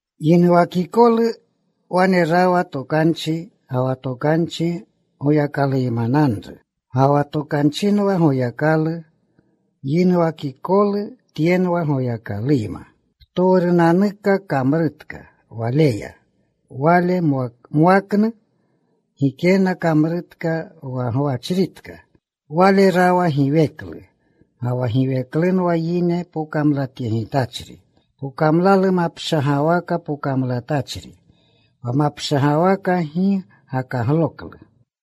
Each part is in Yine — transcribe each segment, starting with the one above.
Yinuwakikolu wane rawa Tokanchi. Ga wa Tokanchi Goyakaluymananru. Ga wa Tokanchinwa Goyakalu. Yinuwakikolu Tyenwa Goyakaluyma. Ptowrunanuka kamrutka Waleya. Wale mwaknu gikenna kamrutka wa gwachritka. Wale rawa giweklu. Ga wa giweklunwa yine pokamlatyegitachri. Pokamlalu mapshagawaka pokamlatachri. Wa mapshagawaka gi gakagloklu.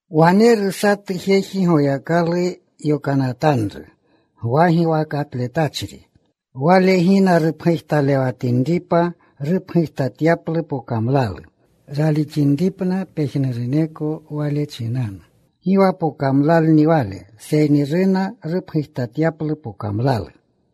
Waneru satu jeji Goyakalu yokanatanru. Gwa giwakatletachri. Wale gina rupgujtalewatinripa, rupgujtatyaplu pokamlalu, ralixinripna pejnuruneko wale chinanu. Gi wa pokamlalni wale, seyni runa rupgujtatyaplu pokamlalu.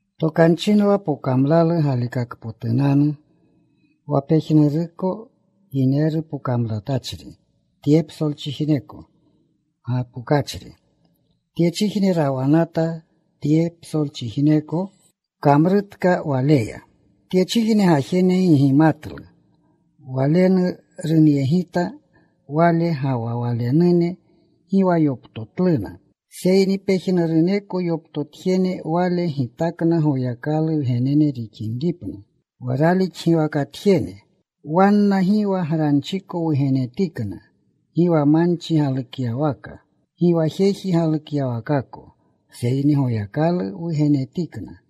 Tokanchinwa pokamlalu galikakpotunanu. Wa pejnuruko yineru pokamlatachri tye psolchijneko gapokachri. Tyechijne rawanata. Tye psolchijneko kamrutka Waleya. Tyechijne gajene gi gimatlu. Walenu runyegita Wale. Ga wa Walenune gi wa yoptotluna. Seyni pejnuruneko yoptotjene Wale gitakna Goyakalu wgenene rixinripna, wa ralixgiwakatjene. Wanna gi wa granchiko wugenetikna, gi wa manchi galukyawaka, gi wa jeji galukyawakako, seyni Goyakaluya wugenetikna.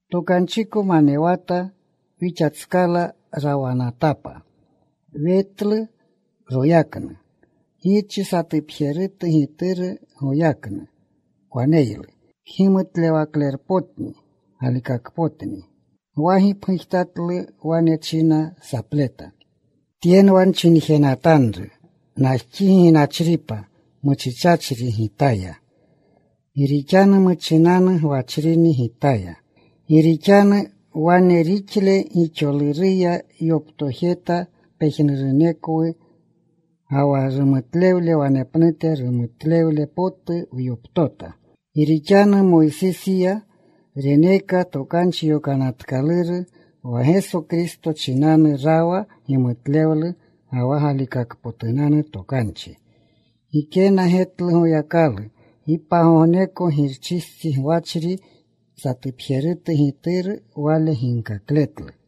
Tokanchiko manewata. Wixatskala rawanatapa. Wetlu royaknu. Girchi satupjerutu Gituru goyaknu waneylu. Kgimutlewaklerpotni. Galikakpotni. Gwa gipgujtatlu. Wane china sapleta, “Tyenwa nchinjenatanru, ‘Najxigi ginachripa, muchichachri gitaya, gi rixanu muchinanu gwachrini gitaya.’” Gi rixanu wane rixle gixoluruya wyoptojeta pejnurunekwu. Ga wa rumutlewle wanepnute rumutlewle potu wyoptota. Gi rixanu Moysisiya reneeka Tokanchi Yokanatkaluru. Wa Geso Kristo chinanu rawa gimutlewlu ga wa galikakpotunanu tokanchi. Gikena getlu Goyakalu gi pagogneko. Girchistsi gwachri, satupjerutu Gituru, Wale ginkakletlu.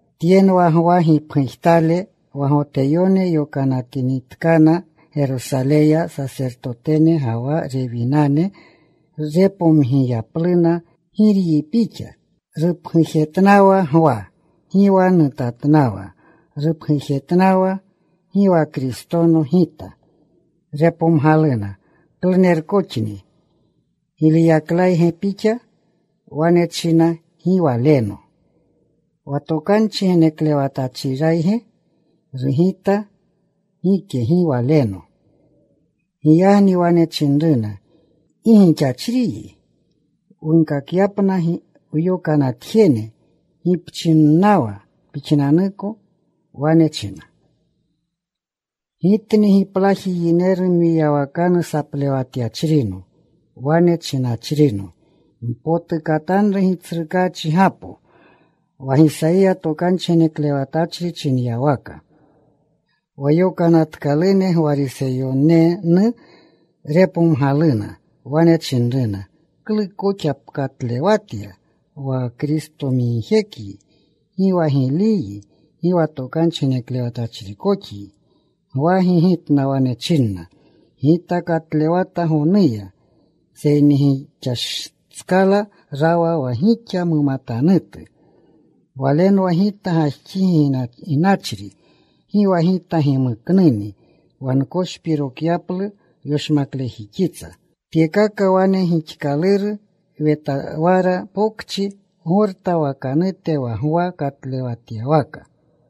Tyenwa Gwa gipgujtale, wa Goteyone yokanatinitkana Gerosaleya sasertotene ga wa Rewinane repomgiyapluna, “¿Giryi pixa?” Rupgujetnawa Gwa. Gi wa nutatnawa. Rupgujetnawa, “Gi wa Kristono gita.” Repomgaluna, “¿Klunerkoxni? ¿Giliyaklayge pixa?” Wane china, “Gi waleno.” “¿Wa tokanchi geneklewatachrirayge?” Rugita, “Gike. Gi waleno.” Giyagni wane chinruna, “¿Gi gixachriyi? wunkakyapna wyokanatjene. ¿Gi pchinnawa pixnanuko?” Wane china: “Gitni giplaji yineru mwiyawakanu saplewatyachrino, wane chinachrino: Mpotukatanru Gitsrukaachigapo, wa Gisayiya tokanchi geneklewatachri chinyawaka.” Wa yokanatkalune, Gwariseyonenu. Repomgaluna. Wane chinruna, “¿Klu koxa pkatlewatya, wa Kristomigjekyi, gi wa Giliyyi, gi wa tokanchi geneklewatachrikoxyi?” Gwa gigitna. Wane chinna, “Gita katlewata gonuya. Seyni gixatskala rawa wa gixa mumatanutu. Walenwa gita gajxigi ginachri. Gi wa gita gimukluni wa nkoshpirokyaplu yoshmaklejixitsa.” Tyekaka wane gixkaluru Wetawara Pokchi, Gorta wakanute, wa Gwa katlewjetyawaka.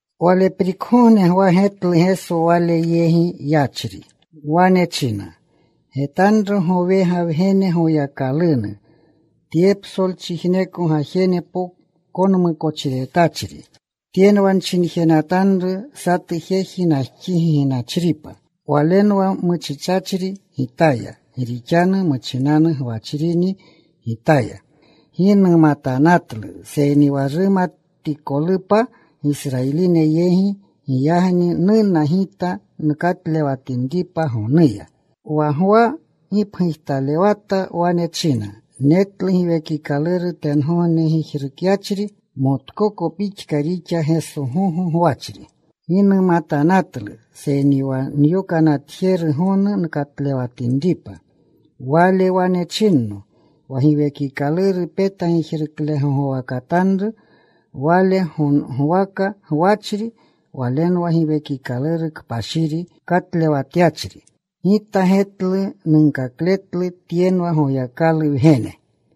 Waleprikgogne Gwa getlu Geso wale yegi yachri. Wane china, “Getanru Gowega Wgene Goyakalunu, tye psolchijneko gajene konmukochiretachri. Tyenwa nchinjenatanru, satu jeji najxigi ginachripa, Walenwa muchichachri gitaya, gi rixanu muchinanu gwachrini gitaya. Gi numatanatlu. Seyni wa rumatikolupa Gisrayiline yegi, giyagni nuna gita nkatlewatinripa gonuya.” Wa Gwa gipgujtalewata. Wane china, “Netlu Giwekikaluru tengogne gijrukyachri. Motkoko pixka rixa Geso gogo gwachri. Gi numatanatlu, seyni wa nyokanatjeru gonu nkatlewatinripa, Wale wane chinno, ‘Wa Giwekikaluru peta gijruklegogwakatanru, Wale gogwaka gwachri, Walenwa Giwekikaluru Kpashiri katlewatyachri.’ Gita getlu. Nunkakletlu Tyenwa Goyakalu Wgene.”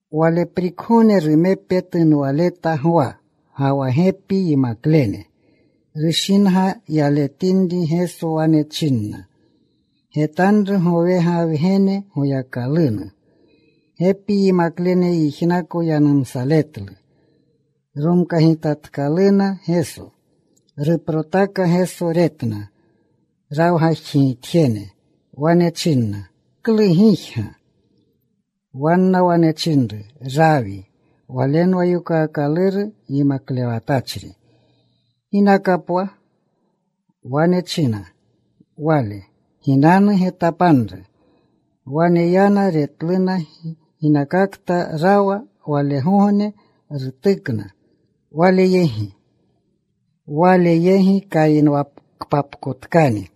Waleprikgogne rumepe tunwaleta Gwa, ga wa gepi yimaklene. Rushinga yaletinri Geso, wane china, “Getanru gowega Wgene Goyakalunu.” Gepi yimaklene yijnako yanumsaletlu. Romkagitatkaluna Geso. Ruprotaka Geso. Retna rawgajxigitjene. Wane chinna, “¿Klu gijga?” Wa wanna wane chinru, “Rawi (walenwa yokaakaluru, Yimaklewatachri), ¿ginaka pwa?” Wane chinna Wale, “Ginanu. Getapanru.” Wane yana. Retluna ginakakta rawa. Walgogne rutukna Wale yegi. Kayinwakpapkotkani.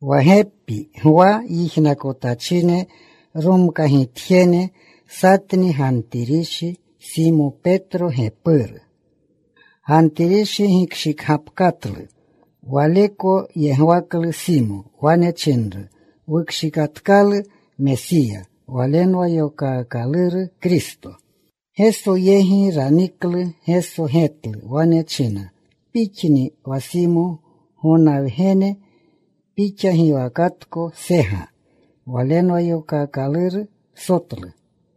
Wa gepi Gwa yijnakotachine, romkagitjene, satni Gantirishi Simo Petro gepuru. Gantirishi gikshikgapkatlu waleko yegwaklu Simo. Wane chinru, “Wukshikatkalu Mesiya.” Walenwa yokaakaluru Kristo. Geso yegi raniklu. Geso getlu. Wane china, “Pixni wa Simo, Gona wgene. Pixa giwakatko Sega. (Walenwa yokaakaluru Sotlu.)”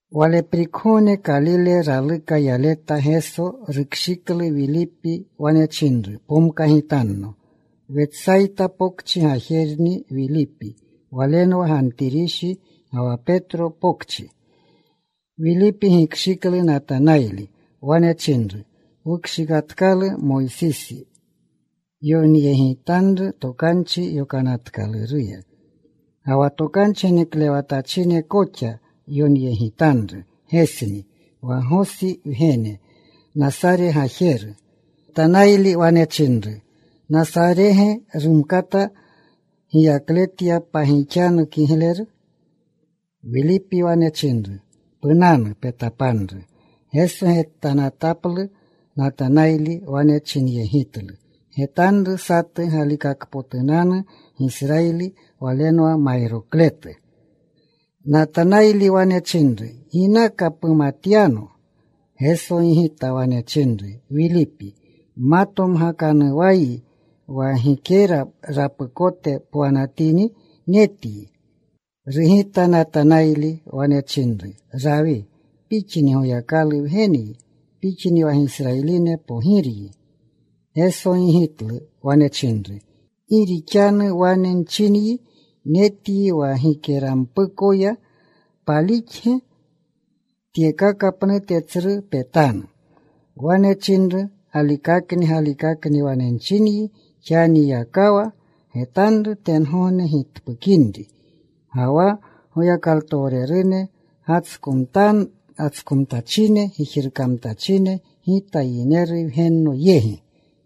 Waleprikgogne Kalile raluka yaleta Geso. Rukshiklu Wilipi. Wane chinru, “Pomkagitanno.” Wetsayta Pokchi gajerni Wilipi. Walenwa Gantirishi ga wa Petro pokchi. Wilipi gikshiklu Natanayli. Wane chinru, “Wukshikatkalu Moysisi yonyegitanru Tokanchi Yokanatkaluruya, ga wa tokanchi geneklewatachine koxa yonyegitanru. Gesni, wa Gosi wgene, Nasare Gajeru.” Natanayli wane chinru, “¿Nasarege rumkata giyakletya pagixanu kigleru?” Wilipi wane chinru, “Punanu. Petapanru.” Geso getanataplu Natanayli. Wane chinyegitlu, “Getanru satu galikakotunanu Gisrayili. Walenwa mayrokletu.” Natanayli wane chinru, “¿Ginaka pumatyano?” Geso gigita. Wane chinru, “Wilipi ma tomgakanuwayi, wa gikera rapukote pwanatini, netyi.” Rugita Natanayli. Wane chinru, “Rawi, Pixni Goyakalu Wgenyi. Pixni wa Gisrayiline Pogiryi.” Geso gigitlu. Wane chinru, “Gi rixanu wane nchinyi, ‘Netyi wa gikerampukoya,’ ¿palixge? Tyekaka pnute tsru petanu.” Wane chinru, “Galikakni, galikakni wane nchingi, xanikakayakawa getanru tengogne gitpukinri, ga wa Goyakalutowrene gatskomtachine, gijrukamtachine Gita Yineru Wgenno yegi.”